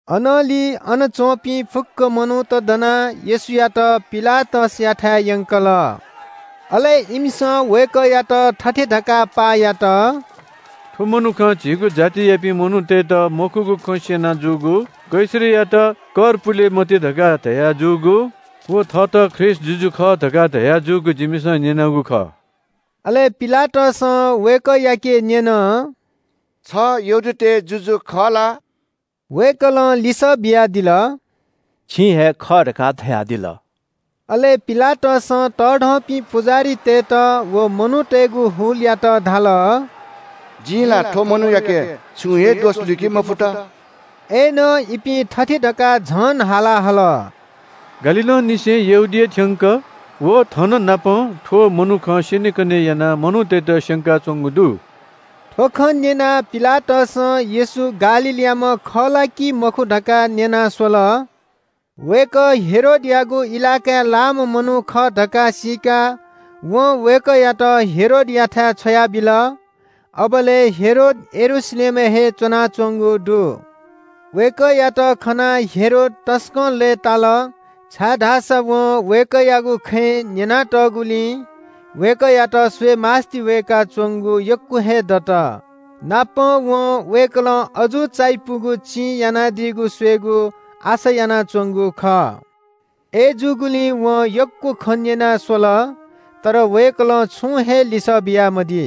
अनंलि अन च्‍वंपिं फुक्‍क मनूत दनाः येशूयात पिलातसयाथाय् यंकल। अले इमिसं वय्‌कःयात थथे धकाः पाः यात – “थ्‍व मनुखं जिमिगु जातियापिं मनूतय्‌त मखुगु खँ स्‍यना जूगु, कैसरयात कर पुले मते धकाः धयाजूगु व थःत ख्रीष्‍ट जुजु खः धकाः धयाजूगु जिमिसं न्‍यनागु खः।” अले पिलातसं वय्‌कःयाके न्‍यन – “छ यहूदीतय् जुजु खः ला?” वय्‌कलं लिसः बियादिल – “छिं हे खः धकाः धयादिल।” अले पिलातसं तःधंपिं पुजाहारीतय्‌त व मनूतय्‌गु हुलयात धाल – “जिं ला थ्‍व मनूयाके छुं हे दोष लुइके मफुत।” अय्‌नं इपिं थथे धकाः झन हाला हल – “गालीलंनिसें यहूदिया थ्‍यंक व थननापं थ्‍व मनुखं स्‍यनेकने यानाः मनूतय्‌त स्‍यंकाच्‍वंगु दु।” थ्‍व खँ न्‍यनाः पिलातसं येशू गालीलयाम्‍ह खः ला कि मखु धकाः न्‍यना स्‍वल। वय्‌कः हेरोदयागु इलाकाय् लाःम्‍ह मनू खः धकाः सीकाः वं वय्‌कःयात हेरोदयाथाय् छ्वयाबिल। अबलय् हेरोद यरूशलेमय् हे च्‍वनाच्‍वंगु दु। वय्‌कःयात खनाः हेरोद तसकं लय्‌ताल, छाय्‌धाःसा वं वय्‌कःयागु बारे न्‍यनातःगुलिं वय्‌कःयात स्‍वयेमास्‍ति वय्‌काच्‍वंगु यक्‍व हे दत। नापं वं वय्‌कलं अजू चायापुगु चिं यानादीगु स्‍वयेगु आशा यानाच्‍वंगु खः। अय्‌जूगुलिं वं यक्‍व खँ न्‍यना स्‍वल, तर वय्‌कलं छुं हे लिसः बियामदी।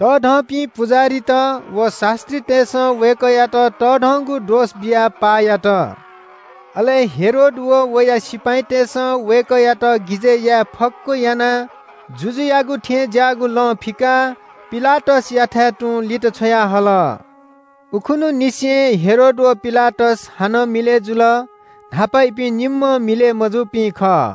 तःधंपिं पुजाहारीत व शास्‍त्रीतय्‌सं वय्‌कःयात तःधंगु दोष बियाः पाः यात। अले हेरोद व वया सिपाइँतय्‌सं वय्‌कःयात गिजय् याये फक्‍व यानाः जुजुयागु थें ज्‍याःगु लं फिकाः पिलातसयाथाय् तुं लित छ्वयाहल। उखुन्‍हुंनिसें हेरोद व पिलातस हानं मिलय् जुल। न्‍हापा इपिं निम्‍ह मिलय् मजूपिं खः।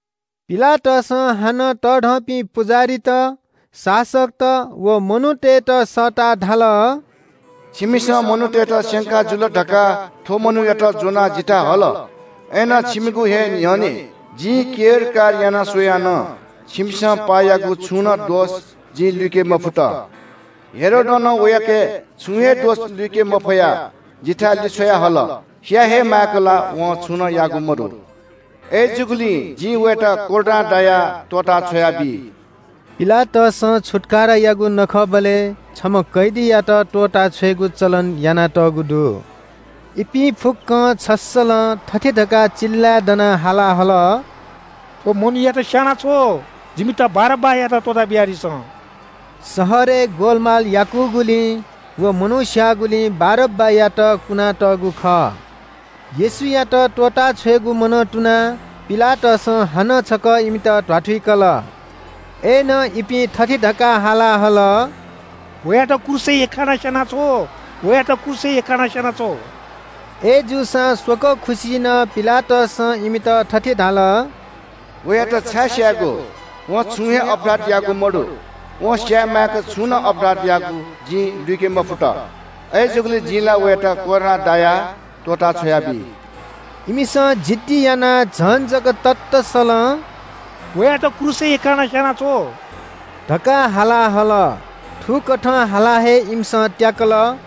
पिलातसं हानं तःधंपिं पुजाहारीत, शासकत व मनूतय्‌त सःताः धाल – “छिमिसं मनूतय्‌त स्‍यंका जुल धकाः थ्‍व मनूयात ज्‍वनाः जिथाय् हल, अय्‌नं छिमिगु हे न्‍ह्यःने जिं केरकार याना स्‍वयां नं छिमिसं पाः याःगु छुं नं दोष जिं लुइके मफुत। हेरोदं नं वयाके छुं हे दोष लुइके मफयाः जिथाय् लिछ्वयाहल। स्‍याये हे माय्‌क ला वं छुं नं याःगु मदु। अय्‌जूगुलिं जिं वयात कोर्रां दायाः त्‍वःता छ्वयाबी।” पिलातसं छुत्‍कारायागु नखःबलय् छम्‍ह कैदीयात त्‍वःताछ्वयेगु चलन यानातःगु दु। इपिं फुक्‍कं छस्‍सलं थथे धकाः चिल्‍लाय् दना हाला हल – “थ्‍व मनूयात स्‍यानाछ्व, जिमित बारब्‍बायात त्‍वःता बियादिसँ।” शहरय् ग्‍वलमाल याकूगुलिं व मनू स्‍याःगुलिं बारब्‍बायात कुना तःगु खः। येशूयात त्‍वःताछ्वयेगु मनं तुनाः पिलातसं हानं छकः इमित ध्‍वाथुइकल। अय्‌नं इपिं थथे धकाः हाला हल – “वयात क्रूसय् यख्‍खानाः स्‍यानाछ्व, वयात क्रूसय् यख्‍खानाः स्‍यानाछ्व।” अय्‌जूसां स्‍वकः खुसि नं पिलातसं इमित थथे धाल – “वयात छाय् स्‍यायेगु? वं छुं हे अपराध याःगु मदु। वं स्‍याये माय्‌क छुं नं अपराध याःगु जिं लुइके मफुत। अय्‌जूगुलिं जिं ला वयात कोर्रां दायाः त्‍वःता छ्वयाबी।” इमिसं जिद्दी यानाः झन जक ततःसलं “वयात क्रूसय् यख्‍खानाः स्‍यानाछ्व” धकाः हाला हल। थुकथं हालाः हे इमिसं त्‍याकल।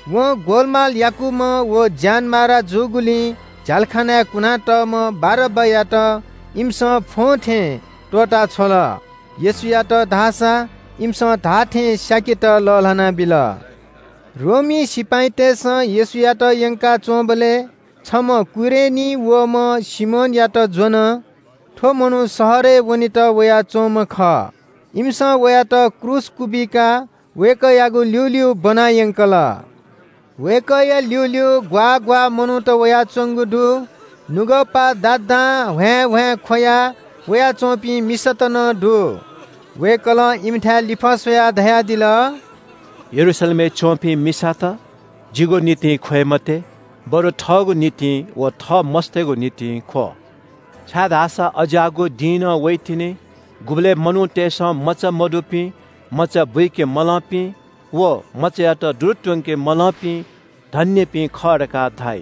वं ग्‍वलमाल याकूम्‍ह व ज्‍यानमारा जूगुलिं झ्‍यालखानाय् कुनातःम्‍ह बारब्‍बायात इमिसं फ्‍वंथें त्‍वःता छ्वल। येशूयात धाःसा इमिसं धाःथें स्‍याकेत लःल्‍हाना बिल। रोमी सिपाइँतय्‌सं येशूयात यंकाच्‍वंबलय् छम्‍ह कुरेनीं वःम्‍ह सिमोनयात ज्‍वन। थ्‍व मनू शहरय् वनेत वयाच्‍वंम्‍ह खः। इमिसं वयात क्रूस क्‍वबिकाः वय्‌कःयागु ल्‍यूल्‍यू ब्‍वनायंकल। वय्‌कःया ल्‍यूल्‍यू ग्‍वाः ग्‍वाः मनूत वयाच्‍वंगु दु। नुगःपा दादां ह्वाँय्‌ह्वाँय् ख्‍वया वयाच्‍वंपिं मिसात नं दु। वय्‌कलं इमिथाय् लिफः स्‍वयाः धयादिल – “यरूशलेमय् च्‍वंपिं मिसात, जिगु निंतिं ख्‍वये मते, बरु थःगु निंतिं व थः मस्‍तय्‌गु निंतिं ख्‍व। छाय्‌धाःसा अज्‍याःगु दिं नं वइतिनि, गुबलय् मनूतय्‌सं मचा मदुपिं, मचा बुइके मलंपिं व मचायात दुरु त्‍वंके मलंपिं धन्‍यपिं खः धकाः धाइ।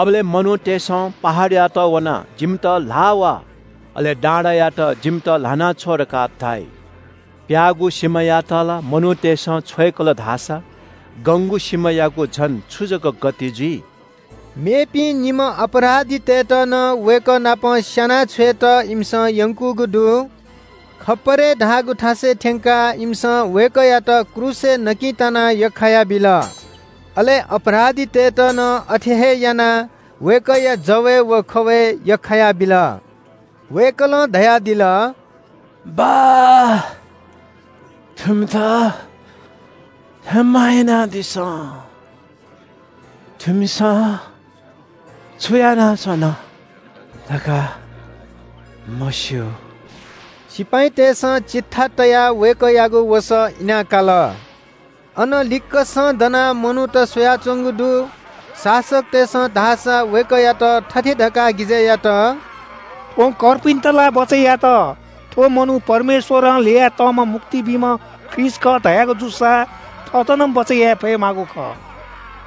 अबलय् “‘मनूतय्‌सं पहाडयात वनाः “जिमित ल्‍हाः वा।” अले डाँडायात – “जिमित ल्‍हाना छ्व” धकाः धाइ।’ “प्‍याःगु सिमायात ला मनूतय्‌सं छ्वय्‌कल धाःसा गंगु सिमायागु झन छु जक गति जुइ?” मेपिं निम्‍ह अपराधीतय्‌त नं वय्‌कः नाप स्‍याना छ्वयेत इमिसं यंकूगु दु। “खप्‍परे” धाःगु थासय् थ्‍यंकाः इमिसं वय्‌कःयात क्रूसय् नकिं तानाः यख्‍खायाबिल। अले अपराधीतय्‌त नं अथे हे यानाः वय्‌कःया जवय् व खवय् यख्‍खायाबिल। वय्‌कलं धयादिल – “बाः, थुमित क्षमा यानादिसँ। थुमिसं छु यानाच्‍वना धकाः मस्‍यू।” सिपाइँतय्‌सं चिट्ठा तयाः वय्‌कःयागु वसः इना काल। अन लिक्‍कसं दनाः मनूत स्‍वयाच्‍वंगु दु। शासकतय्‌सं धाःसा वय्‌कःयात थथे धकाः गिजय् यात – “थ्‍वं कर्पिन्‍त ला बचय् यात, थ्‍व मनू परमेश्‍वरं हे ल्‍ययातःम्‍ह मुक्ति बीम्‍ह ख्रीष्‍ट खः धयागु जूसा थःत नं बचय् याये फयेमाःगु खः।”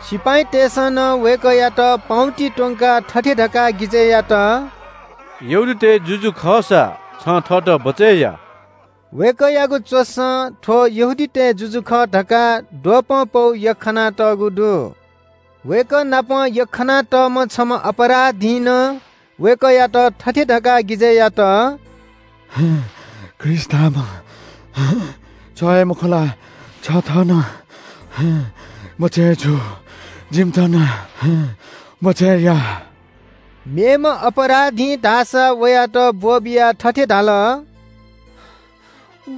सिपाइँतय्‌सं नं वय्‌कःयात पाउँति त्‍वंकाः थथे धकाः गिजय् यात – “यहूदीतय् जुजु खःसा छं थःत बचय् या।” वय्‌कःयागु च्‍वसं – “थ्‍व यहूदीतय् जुजु खः” धकाः द्वपं पौ यख्‍खानातःगु दु। वय्‌कः नाप यख्‍खानातःम्‍ह छम्‍ह अपराधीं नं वय्‌कःयात थथे धकाः गिजय् यात – “ख्रीष्‍ट धाःम्‍ह छ हे मखु ला? छ थः नं बचय् जु जिमित नं बचय् या।” मेम्‍ह अपराधीं धाःसा वयात ब्‍वःबियाः थथे धाल –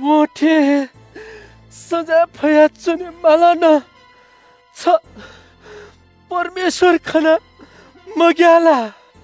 “वं थे हे सजाँय फयाच्‍वने मालं नं छ परमेश्‍वर खनाः मग्‍याः ला?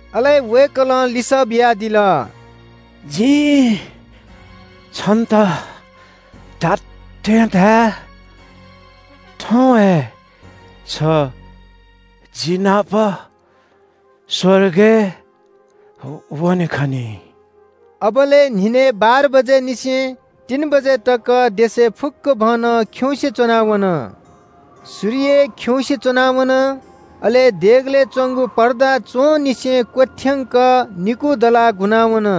अले वय्‌कलं लिसः बियादिल – “जिं छन्‍त धात्‍थें धाये – थौं हे छ जि नाप स्‍वर्गय् वने खनी।” अबलय् न्‍हिनय् बाह्र बजेनिसें तीन बजे तक देशय् फुक्‍कभनं खिउँसे च्‍वना वन। सूर्य खिउँसे च्‍वना वन। अले देगलय् च्‍वंगु पर्दा च्‍वंनिसें क्‍वथ्‍यंक निकू दलाः गुना वन।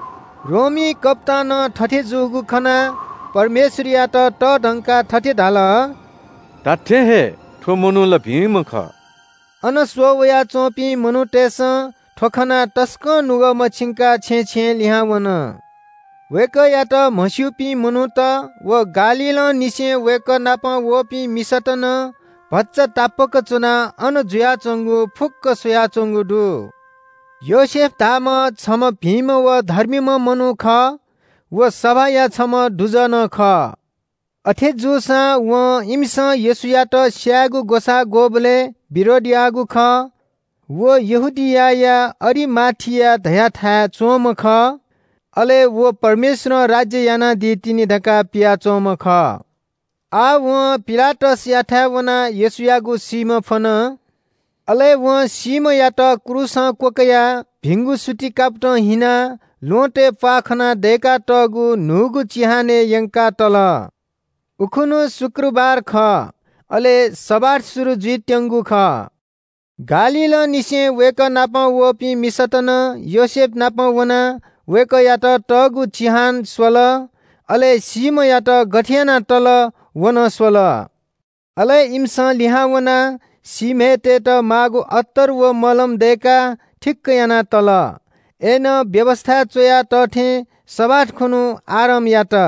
रोमी कप्‍तानं थथे जूगु खनाः परमेश्‍वरयात तःधंकाः थथे धाल – “धात्‍थें हे, थ्‍व मनू ला भिंम्‍ह खः।” अन स्‍वः वयाच्‍वंपिं मनूतय्‌सं थ्‍व खनाः तसकं नुगः मछिंकाः छेँय् छेँय् लिहां वन। वय्‌कःयात म्‍हस्‍यूपिं मनूत व गालीलंनिसें वय्‌कः नाप वःपिं मिसात नं भचा तापाक च्‍वनाः अन जुयाच्‍वंगु फुक्‍क स्‍वयाच्‍वंगु दु। योसेफ धाःम्‍ह छम्‍ह भिंम्‍ह व धर्मीम्‍ह मनू खः। व सभाया छम्‍ह दुजः नं खः। अथे जूसां वं इमिसं येशूयात स्‍यायेगु ग्‍वसाः ग्‍वःबलय् विरोध याःगु खः। व यहूदियाया अरिमाथिया धयाथाय् च्‍वंम्‍ह खः। अले व परमेश्‍वरं राज्‍य यानादी तिनि धकाः पियाच्‍वंम्‍ह खः। आः वं पिलातसयाथाय् वनाः येशूयागु सीम्‍ह फ्‍वन। अले वं सीम्‍हयात क्रूसं क्‍वकयाः भिंगु सुति कापतं हिनाः ल्‍वहँतय् प्‍वाः खना दय्‌कातःगु न्‍हूगु चिहानय् यंकाः तल। उखुन्‍हु तयारीया दिं खः, अले विश्रामबार शुरु जुइत्‍यंगु खः। गालीलंनिसें वय्‌कः नाप वःपिं मिसात नं योसेफनापं वनाः वय्‌कःयात तःगु चिहान स्‍वल। अले सीम्‍हयात गथे यानाः तल, व नं स्‍वल। अले इमिसं लिहां वनाः सीम्‍हय् तयेत माःगु अत्तर व मलम दय्‌काः थिक्‍क याना तल। अय्‌नं व्‍यवस्‍थाय् च्‍वया तः थें शबाथ खुन्‍हु आराम यात।